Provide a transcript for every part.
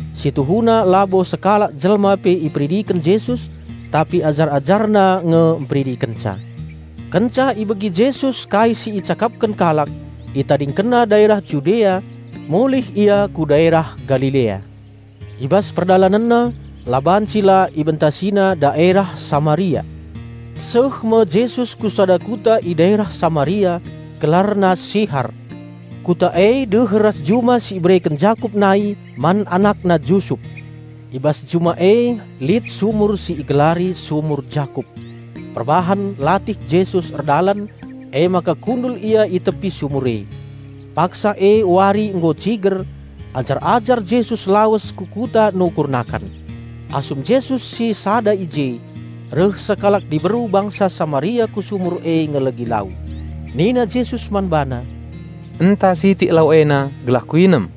(Si tuhuna labo sekalak jelma pe iperidiken Jesus, tapi ajar-AjarNa nge mperidikenca.) Kenca ibegi Jesus kai si icakapken kalak, ItadingkenNa daerah Judea, mulih Ia ku daerah Galilea. I bas PerdalanenNa, la banci la IbentasiNa daerah Samaria. Seh me Jesus ku sada kuta i daerah Samaria, gelarna Sihar. Kuta e deher ras juma si ibereken Jakup nai man anakna Jusup. I bas juma e lit sumur si igelari sumur Jakup. Perbahan latih Jesus erdalan, emaka kundul Ia i tepi sumur e. Paksa e wari nggo ciger; ajar-ajar Jesus lawes ku kuta nukur nakan. Asum Jesus sisada i je, reh sekalak diberu bangsa Samaria ku sumur e ngelegi lau. Nina Jesus man bana, "Enta sitik lau ena gelah Kuinem."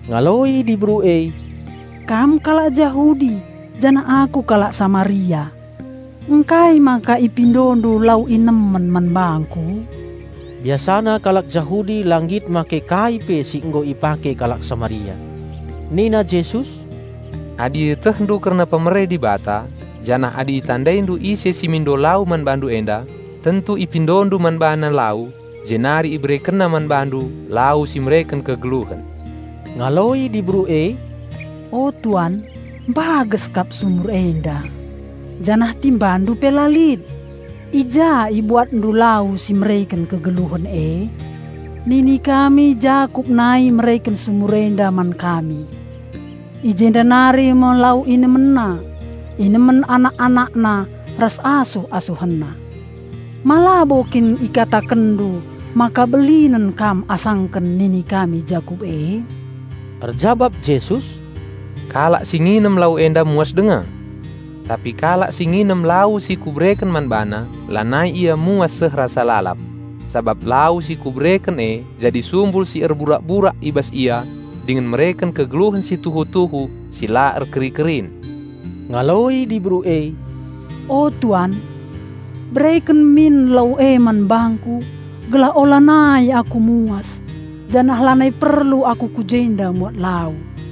Ngaloi diberu e, "Kam kalak Jahudi janah aku kalak Samaria; ngkai maka IpindoNdu lau inemen man bangku?" (Biasana kalak Jahudi la nggit make kai pe si nggo ipake kalak Samaria.) Nina Jesus, "Adi ietehndu kerna pemere Dibata, janah adi itandaindu ise si mindo lau man bandu enda, tentu ipindondu man BaNa lau, jenari IberekenNa man bandu lau si mereken kegeluhen." Ngaloi diberu e, "O Tuan, mbages kap sumur enda, janah TimbaNdu pe la lit. I ja IbuatNdu lau si mereken kegeluhen e? Nini kami Jakup nai mereken sumur enda man kami. I jenda nari me lau inemenna, inemen anak-anakna ras asuh-asuhenna. Ma labo kin IkatakenNdu maka belinen Kam asangken ningken ni kami Jakup e?" Erjabap Jesus, "Kalak si nginem lau enda muas denga. Tapi kalak si nginem lau si Kubereken man bana, lanai ia muas seh rasa lalap. Sabap lau si Kubereken e jadi sumbul si erburak-burak i bas ia dingen mereken kegeluhen si tuhu-tuhu si la erkeri-kerin." Ngaloi diberu e, "O Tuan, bereken min lau e man bangku gelah olanai aku muas, janah lanai perlu aku ku jenda muat lau."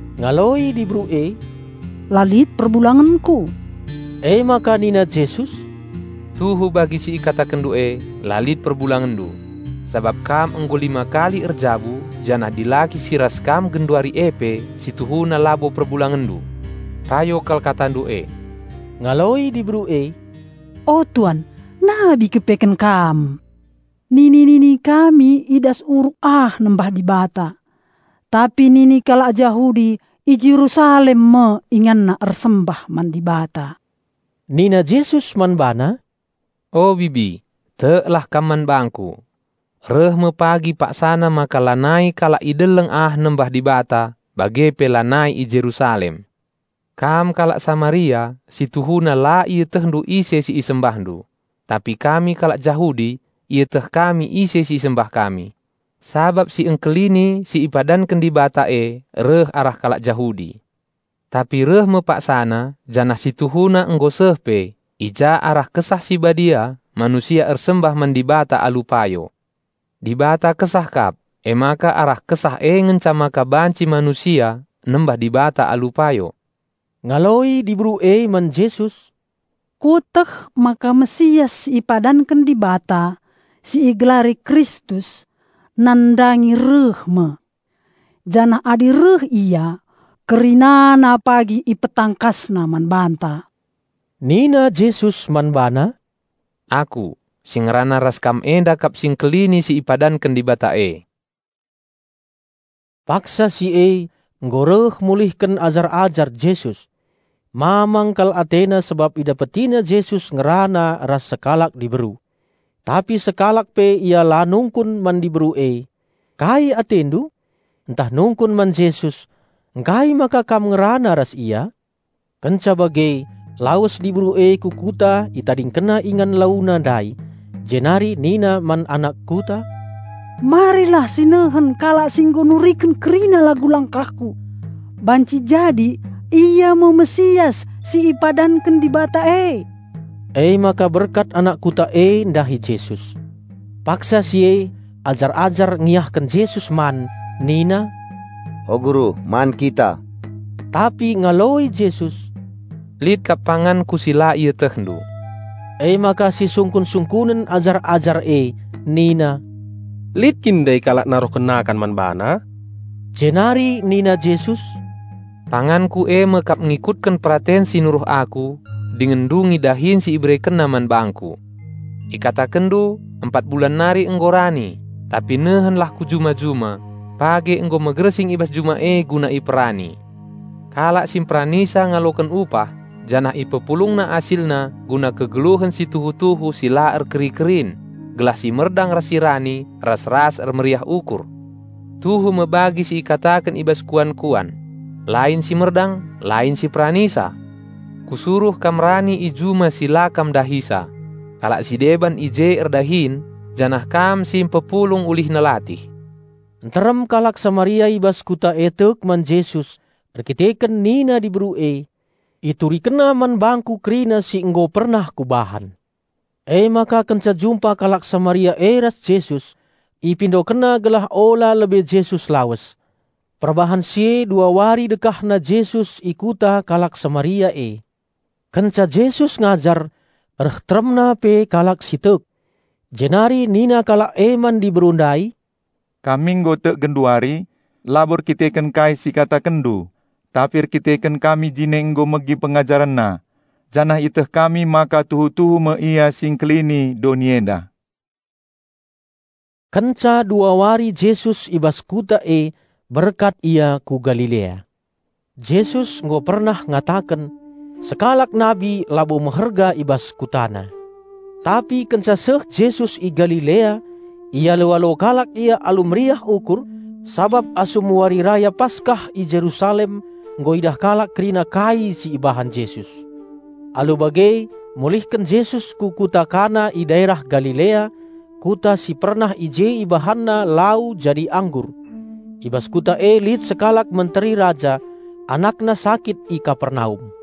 Ngaloi diberu e, "La lit perbulangenku." Emaka nina Jesus, "Tuhu bagi si ikatakenndu e, la lit perbulangenndu. Sabap kam nggo lima kali erjabu janah dilaki si ras kam genduari e pe si tuhuna labo perbulangenndu. Payo kal katandu e." Ngaloi diberu e, "O Tuan, nabi kepeken kam. Nini-nini kami i das uruk ah nembah Dibata, tapi nini kalak Jahudi i Jerusalem me inganna ersembah man Dibata." Nina Jesus man bana, "O bibi, teklah kam man bangKu. Reh me pagi paksana maka lanai kalak i deleng ah nembah Dibata bage pe lanai i Jerusalem. Kam kalak Samaria si tuhuna la ietehndu ise si isembahndu, tapi kami kalak Jahudi ieteh kami ise si isembah kami, sabap Si Engkelini si ipadanken Dibata e reh arah kalak Jahudi. Tapi reh me paksana, janah si tuhuna nggo seh pe, i ja arah Kesah Si Badia manusia ersembah man Dibata alu payo. Dibata Kesah kap, emaka arah Kesah e ngenca maka banci manusia nembah Dibata alu payo." Ngaloi diberu e man Jesus, "Kueteh maka Raja Penampat si ipadanken Dibata, si igelari Kristus, nandangi reh me. Janah adi reh Ia, kerinana pagi IpetangkasNa man banta." Nina Jesus man bana, "Aku, si ngerana ras kam enda kap Si Engkelini si ipadanken Dibata e." Paksa si e nggo reh mulihken ajar-ajar Jesus. Mamang kal atena sabap idapetina Jesus ngerana ras sekalak diberu. Tapi sekalak pe ia la nungkun man diberu e, "Kai atendu?," ntah nungkun man Jesus, "Ngkai maka Kam ngerana ras ia?" Kenca bage lawes diberu e ku kuta itadingkenna ingan launa ndai, jenari nina man anak kuta, "Marilah sinehen kalak si nggo nuriken kerina lagu langkahku. Banci jadi Ia me Raja Penampat si ipadanken Dibata e." Emaka berkat anak kuta e ndahi Jesus. Paksa si e ajar-ajar ngiahken Jesus man nina, "O Guru, man kita!" Tapi ngaloi Jesus, "Lit kap panganKu si la ietehndu." Emaka sisungkun-sungkunen ajar-ajar e nina, "Lit kin ndai kalak naruhken nakan man BaNa?" Jenari nina Jesus, "PanganKu e me kap ngikutken peraten si nuruh Aku, dingen ndungi dahin si IberekenNa man bangKu. Ikatakenndu: Empat bulan nari nggo rani. Tapi nehenlah ku juma-juma; page nggo megersing i bas juma e guna iperani! Kalak si mperanisa ngaloken upah janah ipepulungna asilna guna kegeluhen si tuhu-tuhu si la erkeri-kerin, gelah si merdang ras si rani ras-ras ermeriah ukur. Tuhu me bagi si ikataken i bas kuan-kuan, 'Lain si merdang, lain si peranisa.' Kusuruh kam rani i juma si la kam ndahisa; kalak si deban i je erdahin janah kam si mpepulung ulihna latih." Nterem kalak Samaria i bas kuta e tek man Jesus erdandanken nina diberu e, "IturikenNa man bangku kerina si nggo pernah kubahan." Emaka kenca jumpa kalak Samaria e ras Jesus, ipindokenna gelah ola lebe Jesus lawes. Perbahan si e dua wari dekahna Jesus i kuta kalak Samaria e. Kenca Jesus ngajar reh teremna pe kalak si tek. Jenari nina kalak e man diberu ndai, "Kami nggo tek genduari, labo erdandanken kai si ikatakenndu, tapi erdandanken kami jine nggo megi PengajarenNa, janah ieteh kami maka tuhu-tuhu me Ia Si Engkelini doni enda." Kenca dua wari Jesus i bas kuta e berkat Ia ku Galilea. Jesus nggo pernah ngataken, "Sekalak nabi labo meherga i bas kutana." Tapi kenca seh Jesus i Galilea, ialo-alo kalak Ia alu meriah ukur, sabap asum Wari Raya Paskah i Jerusalem nggo idah kalak kerina kai si ibahan Jesus. Alu bage mulihken Jesus ku kuta Kana i daerah Galilea, kuta si pernah i je IbahanNa lau jadi anggur. I bas kuta e lit sekalak menteri raja, anakna sakit i Kapernaum.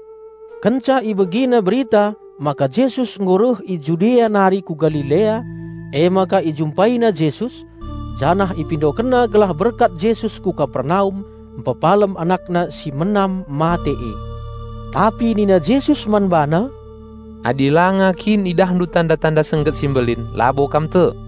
Kenca ibegina berita maka Jesus nggo reh i Judea nari ku Galilea, emaka ijumpaina Jesus, janah ipindokenna gelah berkat Jesus ku Kapernaum mpepalem anakna si menam mate e. Tapi nina Jesus man bana, "Adi langa kin idahndu tanda-tanda sengget si mbelin labo kam tek."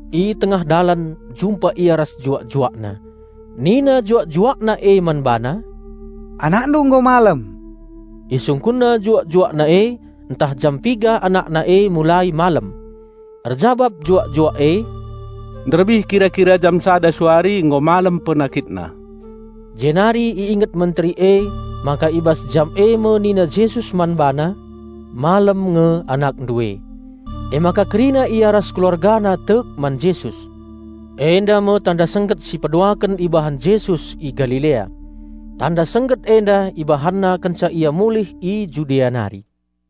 I tengah dalan jumpa ia ras juak-juakna. Nina juak-juakna e man bana, "Anakndu nggo malem." Isungkunna juak-juakna e ntah jam piga anakna e mulai malem. Erjabap juak-juak E "Nderbih kira-kira jam sada suari nggo malem penakitna." Jenari i inget menteri emaka i bas jam e me nina Jesus man bana, "Malem nge anakndu e." Emaka kerina ia ras keluargana tek man Jesus. Enda me tanda sengget si peduaken ibahan Jesus i Galilea. Tanda sengget enda IbahanNa kenca Ia mulih i Judea nari.